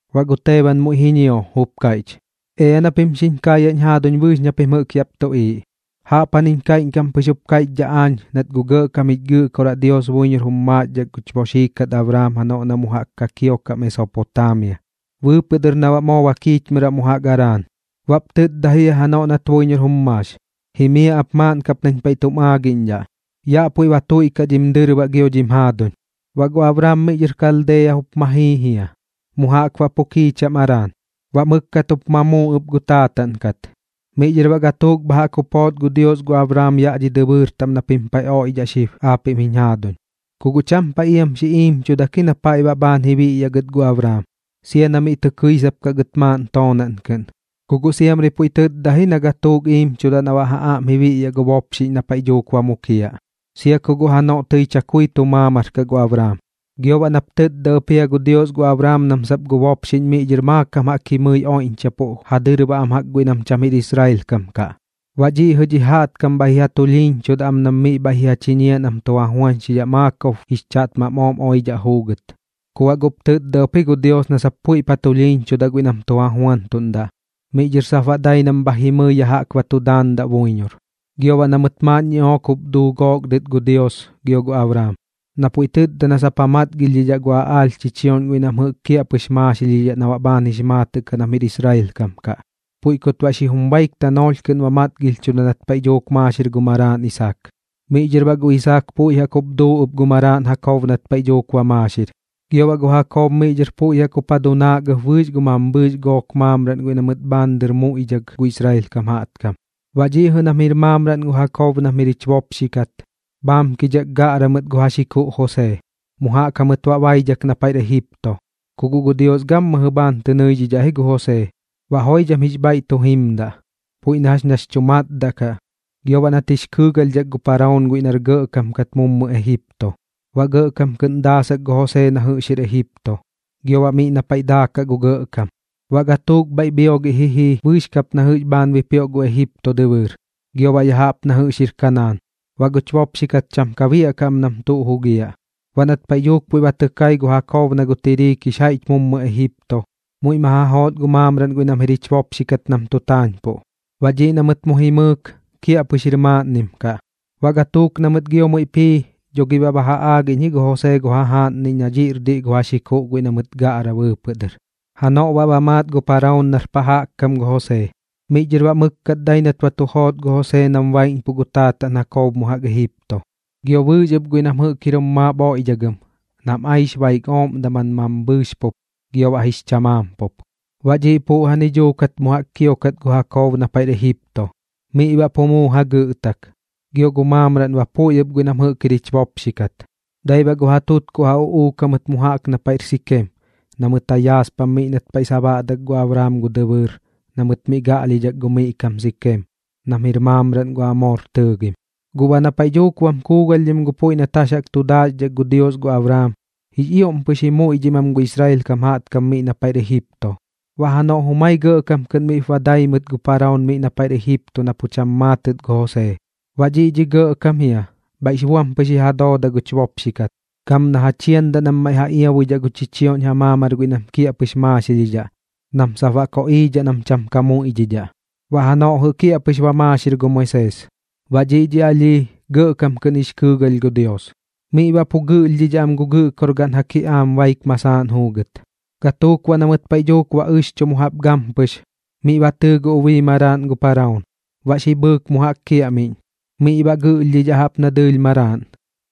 Baꞌ gu Teeban muiꞌ ji ñio, jup kaiꞌch: ―Ea na pim xiñ kaayaꞌñ jaaduñ bɨɨx na pim jɨꞌk yaꞌp tuꞌiiꞌ. Jaꞌpjaniñ kaiꞌñkam pɨx jup kaiꞌchdhaꞌ aañ nat gu gɇꞌkam jich Gɨꞌkoraꞌ Dios buiñor jum maaxdhak guch boxii kat Abraam janoꞌ na mu jaꞌk ka kiokaꞌ Mesopotaamia, bɨɨpɨꞌ dɨr na baꞌ moo ba kiichmɨraꞌ mu jaꞌk Araan. Baꞌp tɨtda jia janoꞌ jɨꞌ nat buiñor jum maax: “Jimiaꞌ ap maaꞌn kap nañ paiꞌ tum aagiꞌñdhaꞌ. Yaꞌ puiꞌ ba tuiꞌkaꞌ dhim dɨrbaꞌ gio dhim jaaduñ.” Baꞌ gu Abraam miꞌ dhɨr Kaldeeya jup ma jii jia, mu jaꞌk baꞌ pu kiicham Araan. Baꞌ mɨkkat jup ma muu ɨp gu taataꞌn kat. Miꞌ dhɨr baꞌ gatuuk bha jaꞌk jup joot gu Dios gu Abraam yaꞌ dhi dɨbɨɨr taꞌm na pim paiꞌ oiꞌdhaꞌ gu xib aapiꞌm jiñ jaaduñ. Ku guꞌ cham paiꞌ iam xi iimchudak ji na paiꞌ baꞌ bhaan ji biꞌyaꞌ gɨt gu Abraam, sia na miꞌ tɨ kɨisap kaꞌ gɨt maaꞌn toonaꞌn kɨꞌn. Ku guꞌ siamri puiꞌ tɨtda ji na gatuuk iimchudaꞌ na baꞌ ja aꞌm ji biꞌyaꞌ gu bopxiꞌñ na paiꞌ dhuuk ba mukiaꞌ, sia ku guꞌ janoꞌ tɨi chakui tu maamar kaꞌ gu Abraam. Gio baꞌ nap tɨtda ɨp jia gu Dios gu Abraam nam sap gu bopxiꞌñ miꞌ dhɨr maakam jaꞌk jimɨi oiꞌñchapuꞌ ja dɨrbaꞌ am jaꞌk guiꞌ nam cham jir Israel kam jaꞌtkam kaꞌ. Baꞌ dhiꞌ jɨꞌ dhi jaꞌtkam bhaiꞌ ji ja tulhiiñchudaꞌ am nam miꞌ bhaiꞌ ji ja chiñiaꞌ nam tu ja juañxidhaꞌ maakob jix chaꞌtmam ooꞌm oidhaꞌ juugɨt. Ku baꞌ guꞌp tɨtda ɨp ji gu Dios na sap puiꞌp ja tulhiiñchudaꞌ guiꞌ nam tu ja juantuꞌndaꞌ, miꞌ dhɨr sap baꞌ dai nam bha jimɨi yaꞌ jaꞌk ba tu daandaꞌ buiñor. Gio baꞌ na mɨt maaꞌn ñiꞌook jup duu gook dɨt gu Dios gio gu Abraam, na puiꞌ tɨtda na sap ja matgilhdhidhaꞌ gu aꞌaalh chichioꞌñ guiꞌ nam jɨꞌk kiaꞌpɨx maaxilhidhaꞌ na baꞌx maatɨꞌ kaꞌ nam jir Israel kam kaꞌ. Puiꞌ kut baꞌ xi jum baik tanoolh kɨꞌn ba matgilhchuda nat paiꞌ dhuuk maaxir gu maraaꞌn Isaak. Miꞌ dhɨr baꞌ gu Isaak puiꞌ jaꞌk jup duu ɨp gu maraaꞌn Jakob nat paiꞌ dhuuk ba maaxir. Gio baꞌ gu Jakob miꞌ dhɨr puiꞌ jaꞌk jup dunaak ɨp bɨɨx gu mambhɨɨx gook maamraꞌn guiꞌ na mɨt bhaan dɨr muiꞌdhak gu Israel kam jaꞌtkam. ’Baꞌ dhiꞌ jɨꞌ nam jir maamraꞌn gu Jakob nam jir jich bopxi kat, bhaamkidhak gaꞌra mɨt gu ja xikuꞌ Josee, mu jaꞌk jamɨt baꞌ baidhak na paiꞌr Ejipto. Ku guꞌ gu Dios gammɨjɨ bhaan tɨ nɨidhidhaꞌ ji gu Josee, baꞌ joidham jix bhaiꞌ tu jimdaꞌ, puiꞌ na jax nax chu matdaꞌ kaꞌ, gio baꞌ nat jix kɨɨgalhdhak gu Paraoon guiꞌ nar gɇꞌkam kat mummɨ Ejipto. Baꞌ gɇꞌkam kɨꞌn daasak gu Josee na jɨꞌx jir Ejipto, gio baꞌ miꞌ na paiꞌ daakaꞌ gu gɇꞌkam. ’Baꞌ gatuuk bhaiꞌ bhiogiꞌ ji jii bɨɨx kap na jɨꞌx bhaan bipioꞌ gu Ejipto dɨbɨɨr, gio baꞌ ya jaꞌp na jɨꞌx jir Kanaan. Baꞌ guch bopxi kat cham ka biaꞌkaꞌ am nam tuꞌ jugiaꞌ. Baꞌ nat paiꞌ dhuuk puiꞌ ba tɨ kai gu Jakob na gu tiriik jix jaiꞌch mummɨ Ejipto, muiꞌ ma ja joot gu maamraꞌn guiꞌ nam jir jich bopxi kat nam tu taañpuꞌ. Baꞌ dhiꞌ na mɨt mu jimɨɨk, kiaꞌpɨx jir maaꞌnnim kaꞌ. Baꞌ gatuuk na mɨt gio muiꞌp jii, dho gi baꞌ ba ja aagiꞌñ ji gu Josee gu jajaaꞌnniꞌñ na dhiꞌr diꞌ gu ja xikuꞌ guiꞌ na mɨt gaꞌra bɨɨpɨꞌ dɨr. Janoꞌ baꞌ ba maat gu Paraoon nar pa jaꞌk kam gu Josee. Miꞌ dhɨr baꞌ mɨkkat dai nat ba tu joot gu Josee nam baiꞌñpuꞌ gu taataꞌn Jakob mu jaꞌk Ejipto, gio bɨɨx ɨp guiꞌ nam jɨꞌk jir jum maap oiꞌdhagɨm nam aix baik ooꞌm daman mambhɨɨx pup gio baꞌ jix chamaam pup. Baꞌ dhiꞌ puꞌjani dhuukat mu jaꞌk kiokat gu Jakob na paiꞌr Ejipto. Miꞌ baꞌ pu muu jagɨꞌtak, gio gu maamraꞌn ba puiꞌ ɨp guiꞌ nam jir jich bopxi kat. Dai baꞌ gu ja tutkuꞌ ja uꞌuuk jamɨt mu jaꞌk na paiꞌr Sikeem na mɨt ja yaaspam miꞌ nat paiꞌ sabaꞌdak gu Abraam gu dɨbɨɨr na mɨt miꞌ gaꞌlhidhak gu miꞌ kam Sikeem, nam jir maamraꞌn gu Amoor tɨɨgim. ’Guꞌ baꞌ na paiꞌ dhuuk bam kuugalhdhim gu puiꞌ nat jax jaꞌk tu daaxdhak gu Dios gu Abraam, jix ioꞌm pɨx ji muiꞌdhim am gu Israel kam jaꞌtkam miꞌ na paiꞌr Ejipto. Baꞌ janoꞌ jumai gɇꞌkam kɨꞌn miꞌ ba dai mɨt gu Paraoon miꞌ na paiꞌr Ejipto na pu cham maatɨt gu Josee. Baꞌ dhiꞌ dhi gɇꞌkam jia bhaiꞌ buam pɨx ji ja dooda guch bopxi kat, gam na ja chiandaꞌ nam maiꞌ ja iabuidhaꞌ gu chichioꞌñ ja maamar guiꞌ nam jɨꞌk kiaꞌpɨx maaxilhidhaꞌ nam sap baꞌ koꞌiidhaꞌ nam cham ka muiꞌdhidhaꞌ. Baꞌ janoꞌ jɨꞌ kiaꞌpɨx ba maaxir gu Moisees, baꞌ dhiꞌ dhi alhii gɇꞌkam kɨꞌn jix kɨɨgalh gu Dios. Miꞌ baꞌ pu gɨꞌlhdhidhaꞌ am gu gɨꞌkorgaꞌn ja kiꞌaam baik masaaꞌn juugɨt. Gatuuk baꞌ na mɨt paiꞌ dhuuk ba ɨxchu mu jaꞌp gampɨx, miꞌ ba tɨɨ gu ubii maraaꞌn gu Paraoon. Baꞌ xi bhɨɨk mu jaꞌk kiaꞌmiꞌñ, miꞌ baꞌ gɨꞌlhdhidhaꞌ jaꞌp na dɨɨlh maraaꞌn.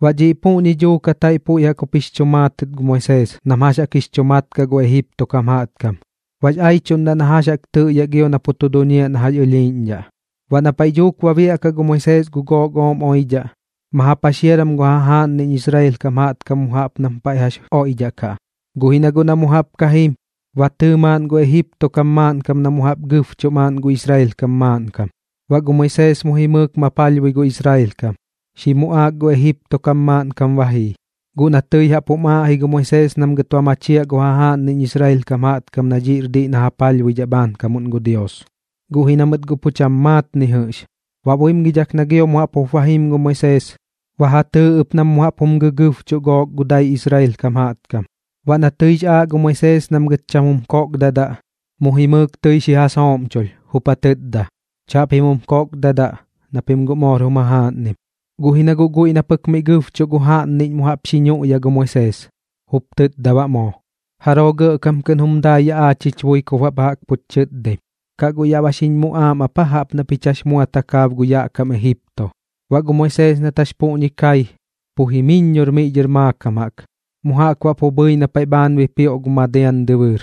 Baꞌ dhiꞌ puꞌñi dhuukat jaiꞌ puiꞌ jaꞌk jup jix chu maatɨt gu Moisees nam jax jaꞌk jix chu mat kaꞌ gu Ejipto kam jaꞌtkam, baꞌx aiꞌchuꞌndaꞌ na jax jaꞌk tɨꞌyaꞌ gio na pu tu duñiaꞌ jax ña ɨlhiiꞌñdhaꞌ. ’Baꞌ na paiꞌ dhuuk ba biaꞌkaꞌ gu Moisees gu gook ooꞌm oidhaꞌ, ma ja paxiaram gu jajaaꞌnniꞌñ Israel kam jaꞌtkam mu jaꞌp nam paiꞌ jax oiꞌdhaꞌkaꞌ. Guꞌ ji na guꞌ na mu jaꞌp ka jim, ba tɨɨ maaꞌn gu Ejipto kam maaꞌnkam na mu jaꞌp gɨbchuꞌ maaꞌn gu Israel kam maaꞌnkam. Baꞌ gu Moisees mu jimɨɨk ma palhbui gu Israel kam, xi muꞌaak gu Ejipto kam maaꞌnkam ba jii. Guꞌ na tɨi jaꞌp jum aaꞌ ji gu Moisees nam gɨt ba machiaꞌ gu jajaaꞌnniꞌñ Israel kam jaꞌtkam na dhiꞌr diꞌ na ja palhbuidhaꞌ bhaankamuꞌn gu Dios, guꞌ ji na mɨt guꞌ pu cham maat ni jɨꞌx. Baꞌ buimgidhak na gio mu jaꞌp jup ba jim gu Moisees, ba ja tɨɨ ɨp nam mu jaꞌp jum gɨgɨbchuꞌ gook gu dai Israel kam jaꞌtkam. Baꞌ na tɨix aaꞌ gu Moisees nam gɨt cham jum kokdadaꞌ, mu jimɨɨk tɨi xi ja sooꞌmchulh, jup ja tɨtda: “¡Chaꞌpim jum kokdadaꞌ, na pim guꞌ moor jum jajaaꞌnnim!” Guꞌ ji na guꞌ guiꞌ na pɨk miꞌ gɨbchuꞌ gu jaꞌnniꞌñ mu jaꞌp xi ñuꞌya gu Moisees, jup tɨtda baꞌ moo: “¿Jaroo gɇꞌkam kɨꞌn jum dai yaꞌ aach jich bui kup baꞌ bha jaꞌk puch chɨtdaim? ¿Kaꞌ guꞌ yaꞌ ba xiñ muꞌaam ap aa jaꞌp na pich jax mua takaab gu yaꞌ kam Ejipto?” Baꞌ gu Moisees nat jax puꞌñi kai, pu jimɨiññor miꞌ dhɨr maakam jaꞌk, mu jaꞌk baꞌ pu bhɨi na paiꞌ bhaan bipioꞌ gu Madian dɨbɨɨr.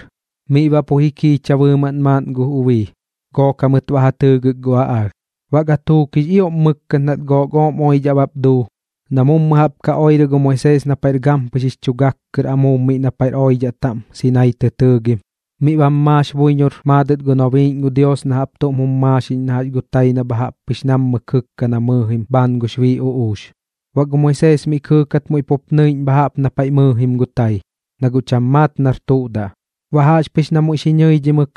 Miꞌ baꞌ pu ji kiicha bɨɨmaꞌn maaꞌn gu ubii, gook jamɨt baꞌ ja tɨɨgɨk gu aꞌaalh. ’Baꞌ gatuuk jix ioꞌm mɨkkat nat gook ooꞌm oidhaꞌ bap duu, na mummɨ jaꞌp ka oirɨ gu Moisees na paiꞌr gampɨx jix chu gak kɨr amuub miꞌ na paiꞌr oidhaꞌ taꞌm Sinaii tɨ tɨɨgim, miꞌ bam maax buiñor maadɨt gu nobiiꞌñ gu Dios na jaꞌp tuꞌm jum maaxiꞌñ na jax gu tai na bha jaꞌp pɨx nammɨ kɨkka na mɨɨjim bhaan gux bii uꞌuux. Baꞌ gu Moisees miꞌ kɨɨkat muiꞌ pup tɨ nɨiꞌñ bha jaꞌp na paiꞌ mɨɨjim gu tai, na guꞌ cham maat nar tuꞌ daꞌ. Baꞌ jaꞌxpɨx na muiꞌ xi ñɨidhimɨk,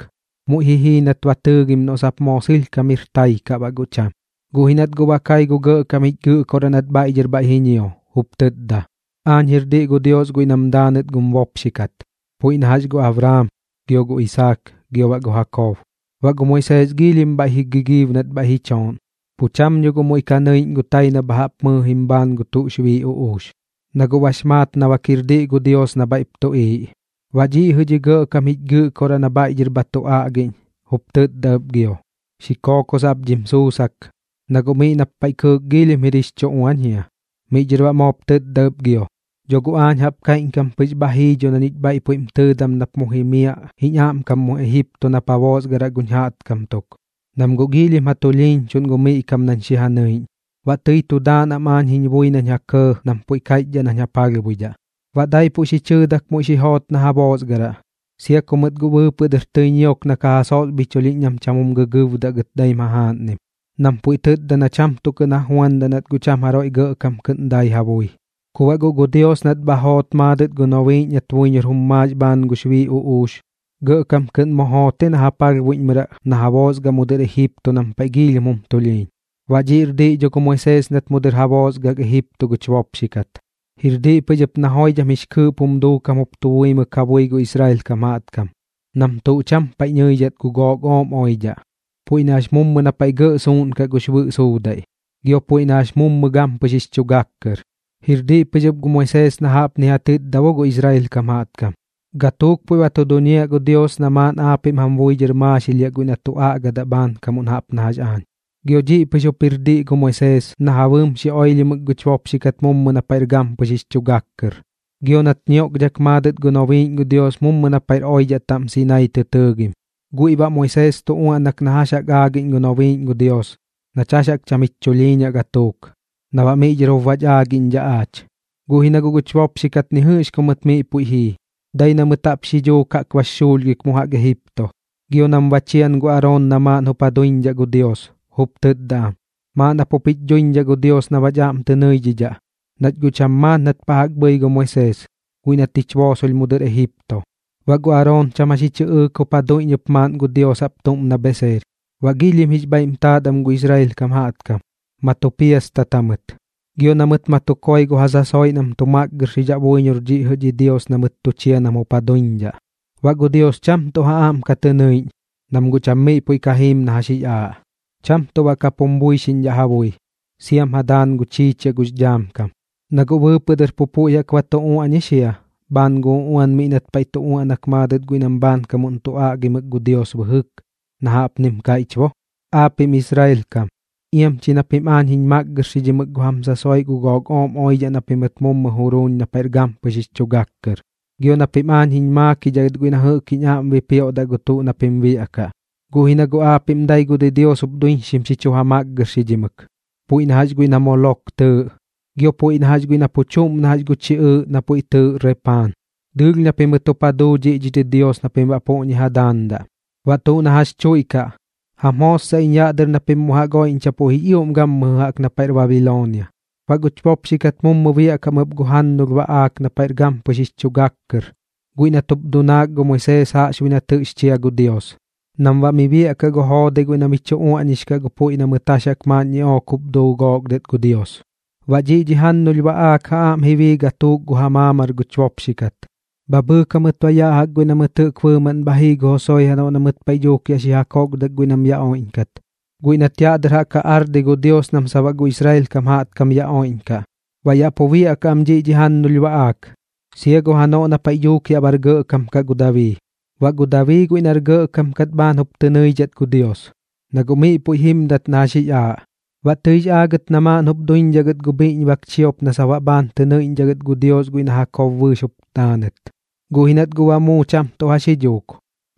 muiꞌ ji jii nat ba tɨɨgim noꞌ moo sɨlhkam jir tai kaꞌ baꞌ guꞌ cham. Guꞌ ji nat guꞌ ba kai gu Gɇꞌkam jich Gɨꞌkoraꞌ nat bhaiꞌ dhɨr bhaiꞌ ba ñio, jup tɨtda: “Aañ jir diꞌ gu Dios guiꞌ nam daanɨt gum bopxi kat, puiꞌ na jax gu Abraam, gio gu Isaak, gio baꞌ gu Jakob.” Baꞌ gu Moisees giilhim bhaiꞌ ji gigiib nat bhaiꞌ ji chooꞌn, pu cham dho guꞌ muiꞌ ka nɨiꞌñ gu tai na bha jaꞌp mɨɨjim bhaan gu tuꞌx bii uꞌuux, na guꞌ bax maat na bak jir diꞌ gu Dios na bhaiꞌp tuꞌiiꞌ. Baꞌ dhiꞌ jɨꞌ dhi Gɇꞌkam jich Gɨꞌkoraꞌ na bhaiꞌ dhɨr bha tu aꞌgiꞌñ, jup tɨtda ɨp gio: “Xi kookosaꞌ ap dhim sussak, na guꞌ miꞌ nap paiꞌ kɨɨk giilhim jir jix chu uañ jia.” Miꞌ dhɨr baꞌ moop tɨtda ɨp gio: “Dho guꞌ aañ jaꞌp kaiꞌñkam pɨx bha jii dho na ñich bhaiꞌ puiꞌm tɨɨdam nap mu jimiaꞌ jiñ aꞌmkam mu Ejipto nap ja boosgaraꞌ guñ jaꞌtkam tuk, nam guꞌ giilhim ja tulhiiñchuꞌn gu miꞌ kam nañ xi ja nɨiꞌñ. Baꞌ tɨi tu daandaꞌ am aañ jiñ bui nañ ja kɇɇ nam puiꞌ kaiꞌchdhaꞌ nañ ja palhbuidhaꞌ.” ’Baꞌ daipuꞌ xi chɨɨdak muiꞌ xi joot na ja boosgaraꞌ, sia ku mɨt guꞌ bɨɨpɨꞌ dɨr tɨi ñiok na ka ja sosbhichulhiꞌñ nam cham jum gɨgɨɨbdaꞌ gɨt daim jajaaꞌnnim, nam puiꞌ tɨtda na cham tuꞌ kɨꞌn ja juandaꞌ nat guꞌ cham jaroiꞌ gɇꞌkam kɨꞌn dai ja bui. Ku baꞌ guꞌ gu Dios nat bha joot maadɨt gu nobiiꞌñ nat buiñor jum maax bhaan gux bii uꞌuux, gɇꞌkam kɨꞌn mu joot ji na ja palhbuiꞌñmɨraꞌ na ja boosgaraꞌ mu dɨr Ejipto nam paiꞌ giilhim jum tulhiiñ. Baꞌ dhiꞌr diꞌ dho gu Moisees nat mummɨ dɨr ja boosgak Ejipto guch bopxi kat. Jir diꞌ pɨx ɨp na joidham jix kɨɨꞌp jum duukam jup tu buimɨk ja bui gu Israel kam jaꞌtkam nam tuꞌ cham paiꞌ nɨidhat gu gook ooꞌm oidhaꞌ, puiꞌ na jax mummɨ na paiꞌ gɇꞌ suuꞌnkaꞌ gux bɨꞌ suudaiꞌ, gio puiꞌ na jax mummɨ gampɨx jix chu gak kɨr. Jir diꞌ pɨx ɨp gu Moisees na jaꞌpni ja tɨtda bo gu Israel kam jaꞌtkam: “Gatuuk puiꞌ ba tu duñiaꞌ gu Dios na maaꞌn aapiꞌm jam bui dhɨr ba maaxilhiaꞌ guiꞌ na tu aꞌgadaꞌ bhaankam jaꞌp na jax aañ.” Gio dhiꞌ pɨx jup jir diꞌ gu Moisees na ja bɨɨm xi oilhimɨk guch bopxi kat mummɨ na paiꞌr gampɨx jix chu gak kɨr, gio nat ñioꞌkdhak maadɨt gu noonbiꞌñ gu Dios mummɨ na paiꞌr oidhaꞌ taꞌm Sinaii tɨ tɨɨgim. Guiꞌ baꞌ Moisees tu uaꞌnak na jax jaꞌk aagiꞌñ gu nobiiꞌñ gu Dios nach jax jaꞌk cham jich chulhiiñaꞌ gatuuk, na baꞌ miꞌ dhɨr jup bach aagiꞌñdhaꞌ aach. ’Guꞌ ji na guꞌ guch bopxi kat ni jɨꞌx ku mɨt miꞌ puiꞌ jii, dai na mɨt jaꞌp xi dhuuk jaꞌk bax xuulhgik mu jaꞌk Ejipto. Gio nam ba chian gu Aroon na maaꞌn jup ja duiñdhaꞌ gu dios, jup tɨtda am: “Maaꞌn jap jup jich duiñdhaꞌ gu dios na baꞌch aꞌm tɨ nɨiꞌñdhaꞌ, nach guꞌ cham maat nat pa jaꞌk bhɨi gu Moisees, guiꞌ nat jich boosolh mu dɨr Ejipto.” Baꞌ gu Aroon cham jax ji chɨꞌɨɨk jup ja duiñ ɨp maaꞌn gu dios jaꞌp tuꞌm na bheseer. Baꞌ giilhim jix bhaiꞌm taat am gu Israel kam jaꞌtkam, ma tu piastat jamɨt, gio na mɨt ma tu koi gu ja sasoiꞌ nam tu makgɨrxidhaꞌ buiñor dhiꞌ jɨꞌ dhi dios na mɨt tu chia nam jup ja duiñdhaꞌ. Baꞌ gu Dios cham tuꞌ ja aꞌm ka tɨ nɨiꞌñ, nam guꞌ cham miꞌ puiꞌ ka jiim na jax jix aaꞌ. Cham tuꞌ baꞌ kap jum buixiꞌñ ja bui, siam ja daan gu chiichiaꞌ gux dhaam kam. Na guꞌ bɨɨpɨꞌ dɨr puiꞌ jaꞌk pu ba tu uaꞌñix jia bhaan gu uꞌuan miꞌ nat paiꞌ tu uaꞌnak maadɨt guiꞌ nam bhaankamuꞌn tu aꞌgimɨk gu Dios bɨjɨk, na jaꞌpnim kaiꞌch bo: Aapiꞌm Israel kam, iam chi na pim aañ jiñ makgɨrxidhimɨk gu jam sasoiꞌ gu gook ooꞌm oidhaꞌ na pimɨt mummɨ juruuñ na paiꞌr gampɨx jix chu gak kɨr, gio na pim aañ jiñ maakidhaꞌ gɨt guiꞌ na jɨꞌk jiñ aꞌm jup bipioꞌdaꞌ gu tuꞌ na pim biaꞌkaꞌ. Guꞌ ji na guꞌ aapiꞌm dai gu didios jup duiñxim xi chu ja makgɨrxidhimɨk, puiꞌ na jax guiꞌ na Molok tɨɨꞌ, gio puiꞌ na jax guiꞌ na pu chuꞌm na jax gu chiꞌɨɨꞌ na puiꞌ tɨɨꞌ Repaan. Dɨɨlh na pimɨt jup ja duu dhiꞌ dhi didios na pim baꞌ puꞌñi ja daandaꞌ. Baꞌ tuꞌ na jax chuiꞌkaꞌ, jam jootsaꞌ iñ yaꞌ dɨr na pim mu jaꞌk oiꞌñchapuꞌ jix ioꞌm gammɨjɨ jaꞌk na paiꞌr Babiloonia. ’Baꞌ guch bopxi kat mummɨ biaꞌkaꞌ am ɨp gu jannulh baꞌaak na paiꞌr gampɨx jix chu gak kɨr guiꞌ nat jup dunaak gu Moisees jaꞌxbuiꞌ nat jɨꞌx chia gu Dios, nam baꞌ miꞌ biaꞌkaꞌ gu joodai guiꞌ na mi chu uaꞌñix kaꞌ gu puiꞌ na mɨt jax jaꞌk maaꞌn ñiꞌook jup duu gook dɨt gu Dios. Baꞌ dhiꞌ dhi jannulh baꞌaak ja aꞌm ji bii gatuuk gu ja maamar guch bopxi kat. Bha bhɨɨk jamɨt baꞌ yaꞌ jaꞌk guiꞌ na mɨt jɨꞌk bɨɨmaꞌn bha jii gu Josue janoꞌ na mɨt paiꞌ dhuuk yaꞌ ja kokdak guiꞌ nam yaꞌ oiꞌñkat, guiꞌ nat yaꞌ dɨr jaꞌk ja ardi gu Dios nam sap baꞌ gu Israel kam jaꞌtkam yaꞌ oiꞌñkaꞌ. Baꞌ yaꞌ pu biaꞌkaꞌ am dhiꞌ dhi jannulh baꞌaak, sia gu janoꞌ na paiꞌ dhuuk yaꞌ bar gɇꞌkam kaꞌ gu Dabii. Baꞌ gu Dabii guiꞌ nar gɇꞌkam kat bhaan jup tɨ nɨidhat gu Dios, na guꞌ miꞌ puiꞌ jimdat na jax jix aaꞌ. Baꞌ tɨix aagɨt na maaꞌn jup duiñdhaꞌ gɨt gu bhiꞌñbak chiop na sap baꞌ bhaan tɨ nɨiꞌñdhaꞌ gɨt gu Dios guiꞌ na Jakob bɨɨx jup daanɨt, guꞌ ji nat guꞌ ba muu cham tuꞌ jax ji dhuuk.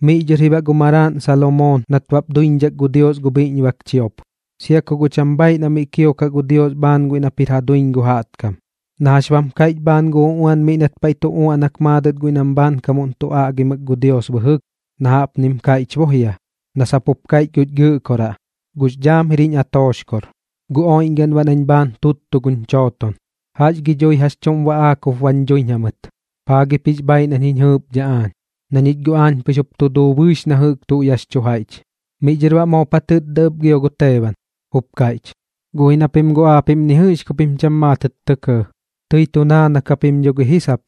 Miꞌ dhɨr ji baꞌ gu maraaꞌn Salomoon nat baꞌp duiñdhak gu Dios gu bhiꞌñbak chiop, sia ku guꞌ cham bhaiꞌ na mi kiokaꞌ gu Dios bhaan guiꞌ nap jir ja duiñ gu jaꞌtkam, na jax bam kaiꞌch bhaan gu uꞌuan miꞌ nat paiꞌ tu uaꞌnak maadɨt guiꞌ nam bhaankam tu aꞌgimɨk gu Dios bɨjɨk, na jaꞌpnim kaiꞌch bo jia na sap jup kaiꞌch guch Gɨꞌkoraꞌ: Gux dhaam jir jiñ atooxkor, gu oiꞌñgaꞌn baꞌ nañ bhaan tuttu guñ chooton. ¿Jax gi dhui jax chuꞌm baꞌaak jup bañ dhuiñ jamɨt? ¿Paa gip jix bhaiꞌ nañ jiñ jɨɨpdhaꞌ aañ? Na ñich guꞌ aañ pɨx jup tu duu bɨɨx na jɨꞌk tuꞌ yaꞌx chu jaiꞌch. Miꞌ dhɨr baꞌ moop ja tɨtda ɨp gio gu Teeban, jup kaiꞌch: ―Guꞌ ji na pim guꞌ aapiꞌm ni jɨꞌx ku pim cham maatɨt tɇ kɇɇ. Tɨi tu naanak japim dho gi ji sap,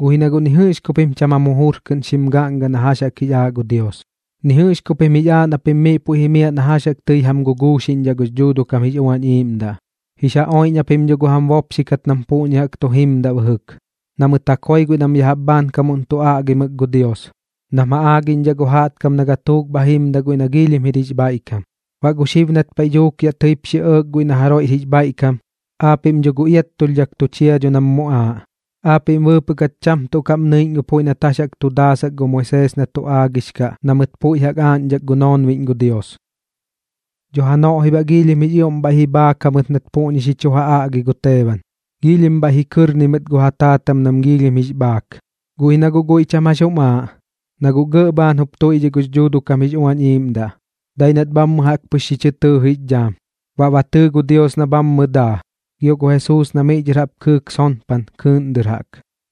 guꞌ ji na guꞌ ni jɨꞌx ku pim cham jam jujur kɨꞌn xim gaꞌnga na jax jaꞌk jix aaꞌ gu Dios, ni jɨꞌx ku pim jix aaꞌ na pim miꞌ puiꞌ jimiaꞌ na jax jaꞌk tɨi jam guguuxiꞌñdhaꞌ gux Dhuuduꞌ kam jix Uañ Iiꞌmdaꞌ. Jix ja oiꞌñ japim dho gu jam bopxi kat nam puꞌñi jaꞌk tu jimdat bɨjɨk, na mɨt ja koi guiꞌ nam ya jaꞌp bhaankamuꞌn tu aꞌgimɨk gu Dios, nam ja aagiꞌñdhaꞌ gu jaꞌtkam na gatuuk bha jim guiꞌ na giilhim jir jix bhaiꞌkam. Baꞌ gu xib nat paiꞌ dhuuk yaꞌ tɨip xi ɇɇk guiꞌ na jaroiꞌr jix bhaiꞌkam, aapiꞌm dho guꞌ iattulhdhak tu chia dho nam muꞌaaꞌ. Aapiꞌm bɨɨpɨꞌ kat cham tuꞌ kaꞌm nɨiꞌñ gu puiꞌ nat jax jaꞌk tu daasak gu Moisees na tu aagix kaꞌ na mɨt puiꞌ jaꞌk aaꞌñdhak gu noonbiꞌñ gu Dios. Dho janoꞌ ji baꞌ giilhim jix ioꞌm bhaiꞌ ji bhaak jamɨt nat puꞌñi xi chu ja aꞌgi gu Teeban, giilhim bhaiꞌ ji kɨrni mɨt gu ja taatam nam giilhim bax bhaak. Guꞌ ji na guꞌ guiꞌ cham jax jum aaꞌ, na guꞌ gɇꞌ bhaan jup tuiꞌdhiꞌ gux Dhuuduꞌ kam jix Uañ Iiꞌmdaꞌ. Dai nat bhammɨ jaꞌk pɨx xi chɨ tɨɨ jix dhaam, baꞌ ba tɨɨ gu Dios na bhammɨ daa, gio gu Jesuus na miꞌ dhɨr jaꞌp kɨɨk sonpan kɨɨꞌn dɨr jaꞌk.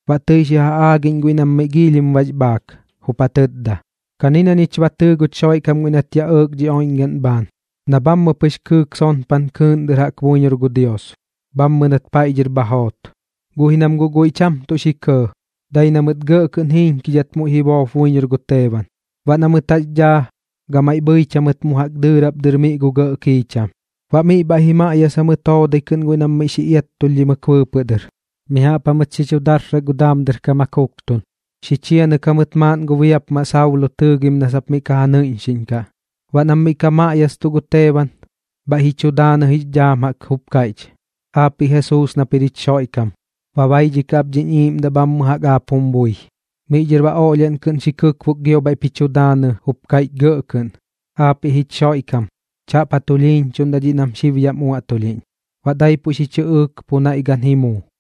Baꞌ tɨi xi ja aagiꞌñ guiꞌ nam miꞌ giilhim bax bhaak, jup ja tɨtda: ―Kani na ñich ba tɨɨ guch Xoiꞌkam guiꞌ nat yaꞌ ɇɇk dhi oiꞌñgaꞌn bhaan, na bhammɨ kɨɨk sonpan kɨɨꞌn dɨr jaꞌk buiñor gu Dios, bhammɨ nat paiꞌ dhɨr bha joot. Guꞌ ji nam guꞌ guiꞌ cham tuꞌ xi kɇɇ, dai na mɨt gɇꞌ kɨꞌn jiiñkidhat muiꞌ ji boop buiñor gu Teeban. Baꞌ na mɨt jax daa, gamaiꞌ bhɨich jamɨt mu jaꞌk dɨɨrap dɨr miꞌ gu gɇꞌ kiicham. Baꞌ miꞌ bhaiꞌ ji maꞌyasa mɨt joodai kɨꞌn guiꞌ nam miꞌ xi iattulhdhimɨk bɨɨpɨꞌ dɨr. Mi jaꞌp jamɨt xi chu darsak gu daam dɨr kam ja kuktun, xi chianɨk jamɨt maaꞌn gu biapmaꞌ Saulo tɨɨgim na sap miꞌ ka ja nɨiꞌñxiꞌñkaꞌ. Baꞌ nam miꞌ ka maꞌyastuꞌ gu Teeban, bhaiꞌ ji chu daanɨ jix dhaam jaꞌk, jup kaiꞌch: ―Aapiꞌ Jesuus nap jir jich Xoiꞌkam, ba baidhikaꞌ ap dhiñ iiꞌmdaꞌ bhammɨ jaꞌk aap jum bui. Miꞌ dhɨr baꞌ oꞌlhiaꞌn kɨꞌn xi kɨkbok gio bhaiꞌp ji chu daanɨ jup kaiꞌch gɇꞌ kɨꞌn: ―Aapiꞌ jich Xoiꞌkam, chaꞌp ja tulhiiñchuꞌndaꞌ dhiꞌ nam xib yaꞌm uaꞌtulhiꞌñ. Baꞌ daipuꞌ xi chɨꞌɨɨk pu naiꞌ gan ji muu.